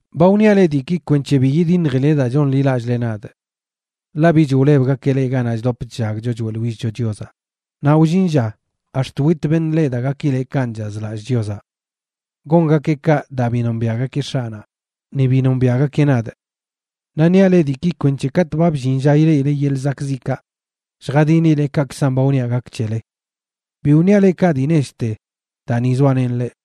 ’Ba wniaꞌ leꞌ diiki kwenc̱he bi yidiṉjileꞌ daa chonḻilallꞌle nadꞌ. Ḻaꞌ bich wlebgakeꞌ leꞌ ganaꞌ chdop chllagcho choeꞌḻwillcho Chiozaꞌ, naꞌ wllin lla ax̱t wit beṉꞌ leꞌ daa gakileꞌ kanꞌ chazlallꞌ Chiozaꞌ. Gongakeꞌ kaꞌ daa bi nombiaꞌgakeꞌ X̱aꞌnaꞌ, ni bi nombiaꞌgakeꞌ nadꞌ. Naꞌ niaꞌ leꞌ diiki kwenc̱he katꞌ ba bllin lla ileꞌile yeḻꞌ zakꞌziꞌkaꞌ, lljadinile kaꞌkzan ba wniaꞌ gak c̱hele. Bi wniaꞌ leꞌ kaꞌ dii nechte daa ni zoalenꞌ leꞌ.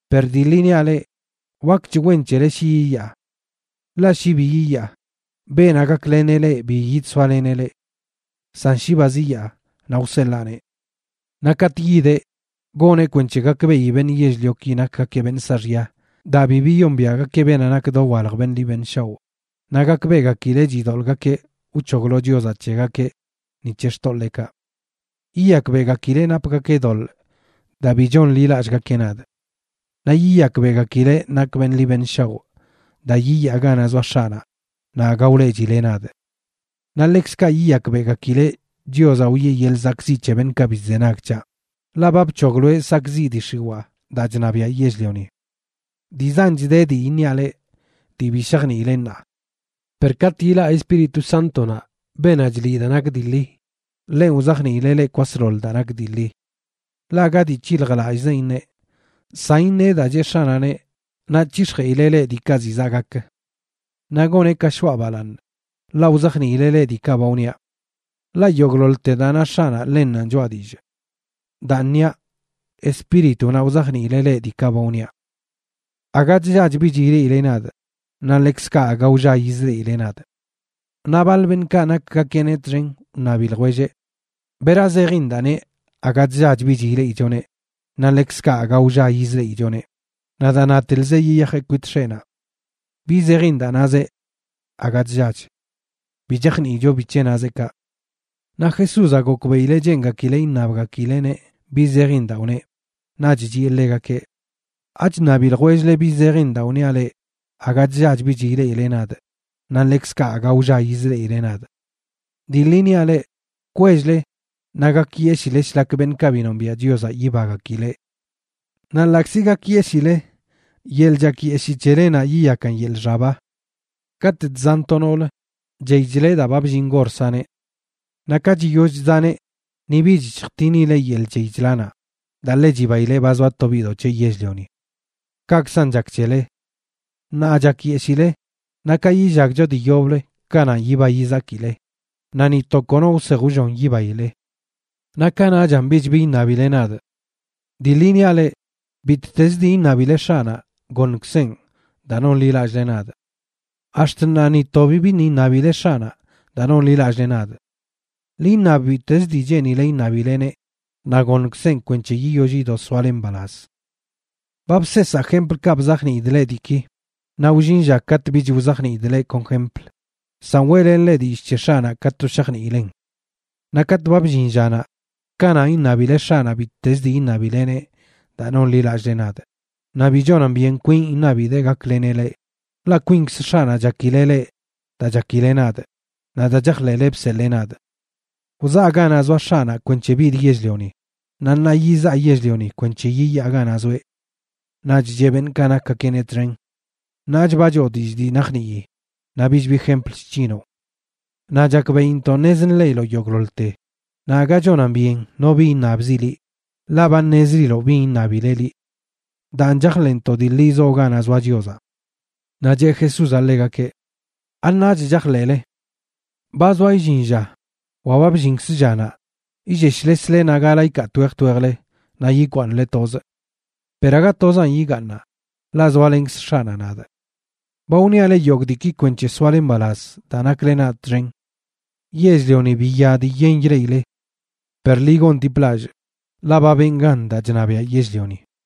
Per dii ḻi niaꞌ leꞌ, wakch wen c̱hele shi yiyaa. Ḻaꞌ shi bi yiyaa, beenaꞌ gakleneꞌ leꞌ bi yidsoaleneꞌ leꞌ. San shi ba ziyaa, naꞌ wseḻaaneꞌ. Naꞌ katꞌ yideꞌ, goneꞌ kwenc̱he gakbeꞌi beṉꞌ yell-lioki nakgakeꞌ beṉꞌ saaxya daa bi biyombiaꞌgakeꞌ beenaꞌ nak dowalj beṉꞌ ḻi beṉꞌ shaoꞌ, naꞌ gakbeꞌgakileꞌ chidoḻꞌgakeꞌ wc̱hoglo Chiozaꞌ c̱hegakeꞌ ni c̱he xtoḻeekaꞌ. Yiyakbeꞌgakileꞌ napgakeꞌ doḻꞌ daa bi chonḻilallꞌgakeꞌ nadꞌ. Naꞌ yiyakbeꞌgakileꞌ nakꞌ beṉꞌ ḻi beṉꞌ shaoꞌ daa yiyaa ganaꞌ zoa X̱aꞌnaꞌ naꞌ aga wleꞌchile nadꞌ. Naꞌ ḻekzkaꞌ yiyakbeꞌgakileꞌ Chiozaꞌ wiꞌe yeḻꞌ zakꞌziꞌ c̱he beṉꞌkaꞌ bi chzenag c̱haꞌ, ḻaꞌ ba bc̱hogloeꞌ sakꞌziꞌ dii x̱iwaa daa chṉabiaꞌ yell-lioni. ’Dii zanch de dii iṉiaꞌ leꞌ, dii bi shajniile ṉaa. Per katꞌ ilaꞌ Espíritu Sántonaꞌ, beenaꞌ chliꞌ daa nak dii ḻi, ḻenꞌ wzajniileꞌ leꞌ kwasḻoḻ daa nak dii ḻi. Ḻaꞌ aga dii c̱hiljlallꞌzeꞌn iṉeꞌ, san iṉeꞌ daa cheꞌ X̱aꞌnaꞌneꞌ, naꞌ c̱hix̱jeꞌileꞌ leꞌ diikaꞌ ziꞌ zaꞌ gak. Naꞌ goneꞌ ka shoꞌa balaaṉ, ḻaꞌ wzajniileꞌ leꞌ diikaꞌ ba wniaꞌ. Ḻaꞌ yogꞌḻoḻte daa na X̱aꞌnaꞌ ḻennanꞌ choꞌa dillꞌ. Daan niaꞌ, Espíritunaꞌ wzajniileꞌ leꞌ diikaꞌ ba wniaꞌ. ’Aga chllach bich ileꞌile nadꞌ, naꞌ ḻekzkaꞌ aga wlla yizleꞌile nadꞌ. Naꞌ baḻ beṉꞌkaꞌ nakgakeꞌneꞌ txen wṉabi ljwelleꞌ: ―¿Bera zejin daa neꞌ aga chllach bich ileꞌichoneꞌ, naꞌ ḻekzkaꞌ aga wlla yizleꞌichoneꞌ, naꞌ daa natelzeꞌ yiyajeꞌ kwit X̱eꞌnaꞌ? ¿Bi zejin daa nazeꞌ “aga chllach”? Bi chajniicho bic̱he nazeꞌ kaꞌ. Naꞌ Jesúzaꞌ gokbeꞌileꞌ cheengakileꞌ iṉabgakileꞌneꞌ bi zejin daa wneꞌ, naꞌch chiꞌe ḻegakeꞌ: ―¿Achṉabi ljwell-le bi zejin daa wniaꞌ leꞌ aga chllach bich ileꞌile nadꞌ, naꞌ ḻekzkaꞌ aga wlla yizleꞌile nadꞌ? Dii ḻi niaꞌ leꞌ, kwell-le naꞌ gakyeshile shlak beṉꞌkaꞌ bi nombiaꞌ Chiozaꞌ yibagakileꞌ. Naꞌ ḻaꞌkzi gakyeshile, yeḻꞌ chakyeshii c̱helenaꞌ yiyakan yeḻꞌ xaba. Katꞌ chzan to noolə, chey chleꞌ daa ba bllin gor saneꞌ. Naꞌ ka chiyoll chzaneꞌ ni bich chjtinileꞌ yeḻꞌ chey chlanaꞌ, daa ḻe chibaileꞌ ba zoa to biꞌdoꞌ c̱heꞌ yell-lioni. Kaꞌkzan chak c̱hele. Ṉaa chakyeshile, naꞌ ka yillagcho dii yoblə kananꞌ yiba yizakile, naꞌ ni to kono wsej wllon yibaile. ’Naꞌ kanaꞌchan bich bi iṉabile nadꞌ. Dii ḻi niaꞌ leꞌ, bittezə dii iṉabile X̱aꞌnaꞌ, goṉkzeꞌn, daa nonḻilallꞌle nadꞌ. Ax̱t ṉaa ni to bibiṉꞌ iṉabile X̱aꞌnaꞌ daa nonḻilallꞌle nadꞌ. Ḻi iṉab bittez dii cheenile iṉabileneꞌ naꞌ goṉkzeꞌn kwenc̱he yiyoll yido soale mbalaz. ’Ba bseesaa jemplkaꞌ bzajniidꞌ leꞌ diiki, naꞌ wllin lla katꞌ bich wzajniidꞌ leꞌ kon jempl, san weꞌlenꞌ leꞌ dillꞌ c̱he X̱aꞌnaꞌ ka to shajniilen. Naꞌ katꞌ ba bllin llanaꞌ, kananꞌ iṉabile X̱aꞌnaꞌ bittezə dii iṉabileneꞌ daa nonḻilallꞌle nadꞌ, naꞌ bi chonan byen kwinꞌ iṉabidee gakleneꞌ leꞌ, ḻaꞌ kwinkz X̱aꞌnaꞌ chakileꞌ leꞌ daa chakile nadꞌ naꞌ daa chajḻeꞌle bseḻee nadꞌ. Wzaa ganaꞌ zoa X̱aꞌnaꞌ kwenc̱he bidꞌ yell-lioni, naꞌ ṉaa yizaa yell-lioni kwenc̱he yiyaa ganaꞌ zoeꞌ. Naꞌch cheꞌ beṉꞌkaꞌ nakgakeꞌneꞌ txen: ―Ṉaach ba choo dillꞌ dii najnii, naꞌ bich bi jempl chc̱hinoꞌ. Naꞌ chakbeꞌintoꞌ ṉez nḻeꞌiloꞌ yogꞌḻoḻte, naꞌ aga chonan byen no bi iṉabzi liꞌ, ḻaꞌ ba ṉezliloꞌ bin iṉabileꞌ liꞌ. Daan chajḻeꞌntoꞌ dii ḻi zoo ganaꞌ zoa Chiozaꞌ. Naꞌ cheꞌ Jesúzaꞌ ḻegakeꞌ: ―¿Aṉaach chajḻeꞌle? Ba zoa illin lla, wa ba bllinkz llanaꞌ, illeshlesle naꞌ gala ikaa twej twejle, naꞌ yikwaaṉle tozꞌ. Per aga tozanꞌ yigaaṉaꞌ, ḻaꞌ zoalenkz X̱aꞌnaꞌ nadꞌ. Ba wniaꞌ leꞌ yogꞌ diiki kwenc̱he soale mbalaz daa nakle nadꞌ txen. Yell-lioni biya dii yen ileꞌile, per ḻi gondiplallꞌ, ḻaꞌ ba benꞌ gan daa chṉabiaꞌ yell-lioni.